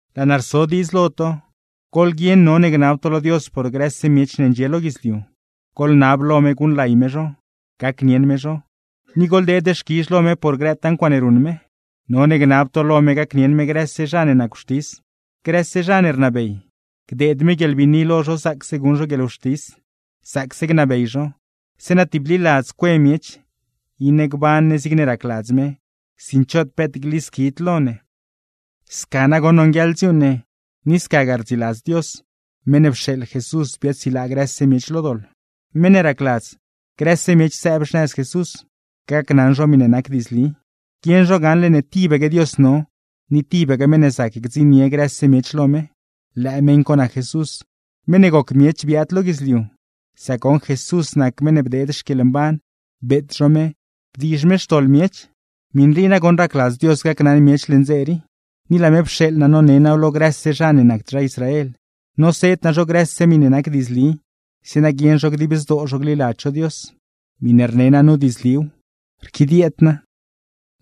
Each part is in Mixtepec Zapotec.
Laa naa rso diidz lo to: Goḻguieṉ none gnab to lo Dios por grëse miech ne ndxie lo guidzliu, goḻnab lo me guṉlay me zho, gacnieṉ me zho; ni goḻdeed xquizh lo me por grëtaa ncuaaṉe ruṉ me. None gnab to lo me gacnieṉ me grëse zha ne nac wxtis, grëse zha ne rnabey, gdeed me guieḻbiini lo zho zaacse guṉ zho guieḻwxtis, zaacse gnabey zho; zeeṉa tibliladz cue miech, iṉe gban ne zigne racladz me, sin choot peet glisquid lo ne. Sca nagoṉ nonguieḻ dziuuṉ ne, ni scagaa rdziladz Dios, meṉ ne pxeeḻ Jesús biaadsilaa grëse miech lo doḻ; meṉ ne racladz grëse miech sëëb xnëz Jesús, gacnaṉ zho miṉe nac diidzli. Guieṉ zho gaṉle ne tibaque Dios no, ni tibaque meṉ ne zac gdziṉnie grëse miech lo me: lëë meṉ co nac Jesús, meṉ ne goc miech biaad lo guidzliu; sac goṉ Jesús nac meṉ ne bdeed xquieḻmban, beet zho me, bdiizh me xtoḻ miech. Miṉ rii nagoṉ racladz Dios gacnaṉ miech leṉ dze rii. Ni laa me pxeeḻ naa none naaw lo grëse zha ne nacd zha Israel, noseed naa zho grëse miṉe nac diidzli, zeeṉa guieṉ zho dib zdoo zho gliladz zho Dios. (Miṉe rne naa nu diidzliw, rquidieed naa.)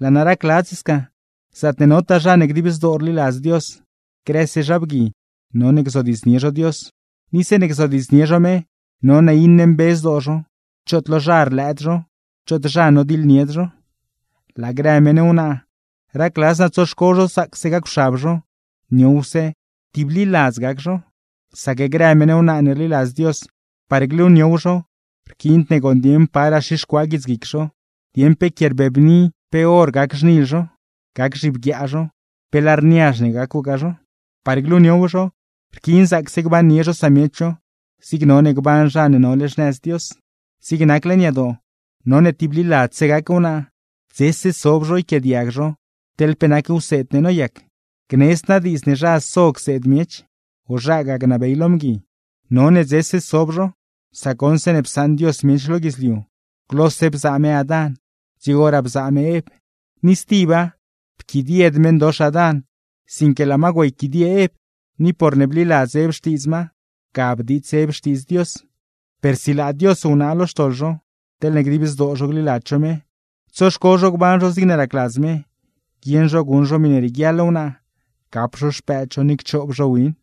Laa naa racladz sca, zaatne notaa zha ne dib zdoo rliladz Dios, grëse zha bgui none gzodiidznie zho Dios. Ni zeeṉe gzodiidznie zho me, none iṉe mbe zdoo zho, choot lo zha rlëëd zho, choot zha nodiḻnied zho. Laa grë meṉ wnaa, racladz naa tsoxco zho zaacse gacwxab zho, niowse, tibliladzse gac zho. Sac grë meṉ wnaa ne rliladz Dios, par gluniow zho rquiind ne gooṉ dieṉ paraa xixcuaa guitsguic zho, dieṉ pe quie rbebni, pe or gac xnil zho, gac zhibguiaa zho, pe lar niazh ne gacwgaa zho. Par gluniow zho, rquiin zaacse gbannie zho samiech zho, zig none gban zha ne nole xnëz Dios. Zig nac leṉ yadoo, none tibliladzse gac zho, dzese sob zho yquiaadiag zho teḻ pe nac wseed ne noyac; gnedzd naa diidz ne zha so cseed miech, o zhagaa gnabey lo mgui. None dzese sob zho, sac goṉ zeeṉe psaṉ Dios miech lo guidzliu, glose bzaa me Adán, dzigoraa bzaa me Ev. Ni stiba, pquidied meṉdox Adán, sinque laa ma güeyquidie Ev; ni porne bliladz Ev xtiidz ma, ga bdiits Ev xtiidz Dios. Per silaa Dios wnaa lo xtoḻ zho, teḻne dib zdoo zho gliladz zho me, tsoxco zho gban zho zigne racladz me, guieṉ zho guṉ zho miṉe rieguiaḻ wnaa, gap zho xpëëd zho ni cchoob zho win.